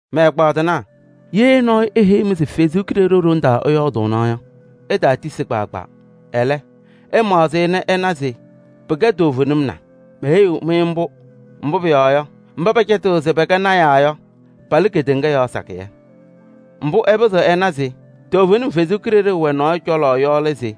Mɛ-ɛgbaadɩnaa! Ye nɔɔyʋ eheyi-mɩ se Ɛsɔ Kalɩzaɣ ɖoŋ ɛyɔɔdʋʋna yɔ, ɩtaatisi kpaagbaa. Ɛlɛ, ɩmaɣzɩ-ɩ nɛ ɩna se pɩkɛ toovenim na. Meheyiɣ-mɩ mbʋ, mbʋ pʋyɔɔ yɔ, mba pɛcɛtɩɣ se pɛkɛ lɔɔyɩsɩ tɩnaa yɔ palɩ kedeŋa yɔɔ sakɩyɛ. Mbʋ ɩpɩzɩɣ ɩnanɩ se toovenim Ɛsɔ Kalɩzaɣ wɛ nɔɔyʋ cɔlɔ yɔ lɛ se: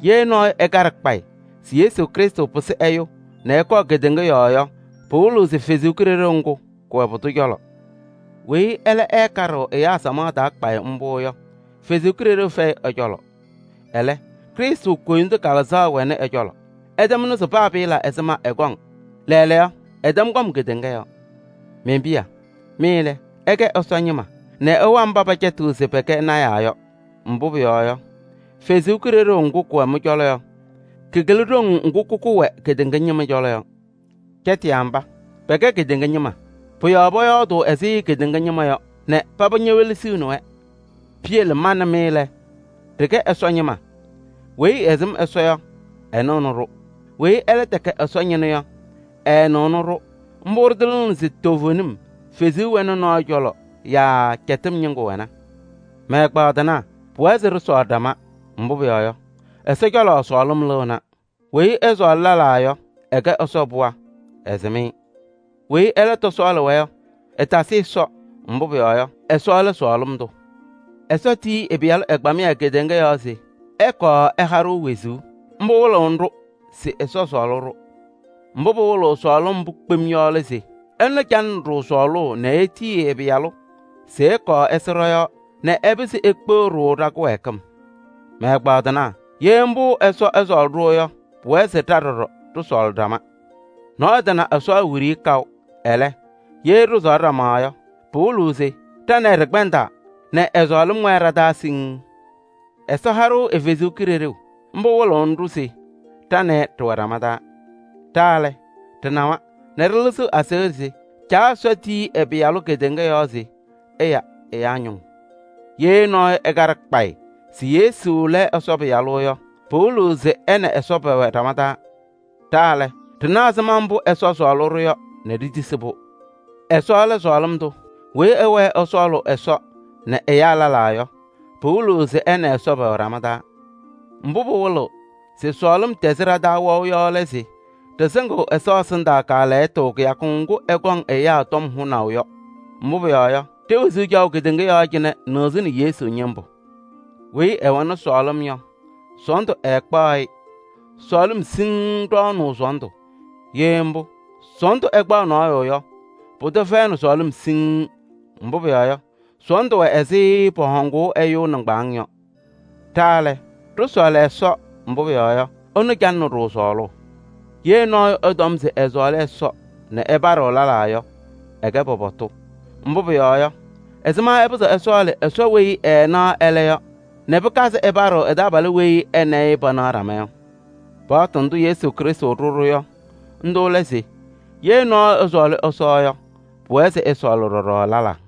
ye nɔɔyʋ ɛkaɖɩ kpayɩ se Yesu Krɩstʋ pɩsɩ ɛyʋ nɛ ɛkɔɔ kedeŋa yɔɔ yɔ, pɩwɩlɩɣ se Kalɩzaɣ ŋga kɛwɛ pʋdʋ cɔlɔ. Weyi ɛlɛ ɛɛkaɖɩɣ ɛyaa samaɣ taa kpayɩ mbʋ yɔ, Ɛsɔ Kalɩzaɣ fɛyɩ ɛ-cɔlɔ. Ɛlɛ, Krɩstʋ koyindu kalɩzaɣ wɛnɩ ɛ-cɔlɔ. Ɩtɛm nɩʋ se paa pɩɩla ɛzɩma ɛkɔŋ, lɛɛlɛɛyɔ ɛtɛm kɔm kedeŋa yɔɔ. Men-piya! Mɩ lɛ, ɩkɛ Ɛsɔ ñɩma nɛ ɩwa mba pɛcɛtɩɣ se pɛkɛ lɔɔyɩsɩ tɩnaa yɔ. Mbʋ pʋyɔɔ yɔ, Ɛsɔ Kalɩzaɣ ŋga kɛwɛ mɩ-cɔlɔ yɔ, kakɩlɩ ɖoŋ ŋga kaka wɛ kedeŋa ñɩma cɔlɔ yɔ. Cɛtɩyaa mba, pɛkɛ kedeŋa ñɩma. Pʋ-yɔɔ pɔyɔɔdʋʋ ɛzɩ kedeŋa ñɩma yɔ nɛ paba ñewelesiɣni-wɛ. Piyele ma nɛ mɩ lɛ, ɖɩkɛ Ɛsɔ ñɩma. Weyi ɛsɩm Ɛsɔ yɔ, ɛnɩɣnɩ-ɖʋ. Weyi ɛlɛ tɛkɛ Ɛsɔ ñɩnʋ yɔ, ɛɛnɩɣnɩ-ɖʋ. Mbʋ ɖɩtɩlɩɣnɩ se toovenim Kalɩzaɣ wɛnɩ nɔɔyʋ cɔlɔ yaa cɛtɩm ñɩŋga wɛna. Mɛ-ɛgbaadɩnaa! Pʋwɛɛ se ɖɩsɔɔlɩ ɖama, mbʋ pʋyɔɔ yɔ, Ɛsɔ cɔlɔ sɔɔlɩm lɩɣna. Weyi ɛsɔɔlɩ lɛlaa yɔ, ɛkɛ Ɛsɔ pɩɣa, ɛsɩm-ɩ. Weyi ɛlɛ tɔsɔɔlɩ-wɛ yɔ, ɛtasɩ Ɛsɔ, mbʋ pʋyɔɔ yɔ, Ɛsɔ lɛ sɔɔlɩm tʋ. Ɛsɔ tiyi ɛ-Pɩyalʋ ɛgbamɩyɛ kedeŋa yɔɔ se ɛkɔɔ ɛha-ɖʋ wezuu. Mbʋ ɛwɩlɩɣnɩ-ɖʋ se ɛsɔɔlɩ-ɖʋ. Mbʋ pɩwɩlɩɣ sɔɔlɩm mbʋ kpem yɔ lɛ se: ɛnʋ calɩnɩ-ɖʋ sɔɔlʋʋ nɛ etiyi ɛ-Pɩyalʋ se ɛkɔɔ ɛsɩ ɖɔ-yɔɔ nɛ ɛpɩzɩ ekpeɣ-ɖʋ ɖa-kɩwɛɛkɩm. Mɛ-ɛgbaadɩnaa! Ye mbʋ Ɛsɔ ɛsɔɔlɩ-ɖʋ yɔ, pʋwɛɛ se ɖa ɖɔɖɔ ɖɩsɔɔlɩ ɖama. Nɔɔyʋ tana Ɛsɔ wiɖiyi kaʋ. Ɛlɛ, ye ɖɩsɔɔlɩ ɖama yɔ, pɩwɩlɩɣ se ɖa nɛ ɩ ɖɩkpɛndaa nɛ ɛ-sɔɔlɩm wɛɛ ɖa-taa siŋŋ. Ɛsɔ ha-ɖʋ ɛ-Kalɩzaɣ, mbʋ wɩlɩɣnɩ-ɖʋ se ɖa nɛ ɩ ɖɩwɛ ɖama taa. Ɖa lɛ, ɖɩnawa nɛ ɖɩlɩzɩɣ aseɣɖe se Caa Ɛsɔ tiyi ɛ-Pɩyalʋ kedeŋa yɔɔ se ɛya ɛyaa ñʋŋ. Ye nɔɔyʋ ɛkaɖɩ kpayɩ se Yesu lɛ Ɛsɔ Pɩyalʋ yɔ, pɩwɩlɩɣ se ɛ nɛ Ɛsɔ pɛwɛ ɖama taa. Ɖa lɛ, ɖɩna ɛzɩma mbʋ Ɛsɔ sɔɔlɩ-ɖʋ yɔ nɛ ɖitisi pʋ-yɔɔ. Ɛsɔ lɛ sɔɔlɩm tʋ, weyi ɛwɛɛ ɛsɔɔlʋʋ Ɛsɔ nɛ ɛyaa lɛlaa yɔ, pɩwɩlɩɣ se ɛ nɛ Ɛsɔ pɛwɛ ɖama taa. Mbʋ pɩwɩlɩɣ se sɔɔlɩm tɛzɩ ɖa-taa wɛʋ yɔ lɛ se ɖɩsɩŋɩɣ Ɛsɔ ɛsɩndaa kaalɛyɩtʋ kɩyakʋ ŋgʋ ɛkɔŋ ɛyaa tɔm hʋnaʋ yɔ. Mbʋ pʋyɔɔ yɔ, ɖe-wezuu caɣʋ kedeŋa yɔɔ cɩnɛ nɩɣzɩnɩ Yesu ñɩmbʋ. Weyi ɛwɛnɩ sɔɔlɩm yɔ, sɔɔndʋ ɛɛkpaɣ-ɩ, sɔɔlɩm siŋŋ ɖɔɔnʋʋ sɔɔndʋ. Ye mbʋ, sɔɔndʋ ɛkpaɣ nɔɔyʋ yɔ, pʋdʋ fɛyɩnɩ sɔɔlɩm siŋŋ, mbʋ pʋyɔɔ yɔ, sɔɔndʋ wɛ ɛzɩ pɔhɔŋʋʋ ɛyʋ nɩŋgbaŋʋʋ yɔ. Ɖa lɛ, ɖɩsɔɔlɩ Ɛsɔ, mbʋ pʋyɔɔ yɔ, ɛnʋ calɩnɩ-ɖʋ sɔɔlʋʋ. Ye nɔɔyʋ ɛtɔm se ɛsɔɔlɩ Ɛsɔ nɛ ɛpaɖɩɣ lɛlaa yɔ, ɛkɛ pɔpɔtʋ. Mbʋ pʋyɔɔ yɔ, ɛzɩma ɛpɩzɩɣ ɛsɔɔlɩ Ɛsɔ weyi ɛɛnaɣ ɛlɛ yɔ nɛ pɩkazɩ ɛpaɖɩ ɛ-taabalʋ weyi ɛ nɛ ɩ panaɣ ɖama yɔ? Paɣtʋ ndʋ Yesu Krɩstʋ ɖʋ-ɖʋ yɔ, ndʋ lɛ se: ye nɔɔyʋ ɛsɔɔlɩ Ɛsɔ yɔ, pʋwɛɛ se ɛsɔɔlɩ ɖɔɖɔ lɛlaa.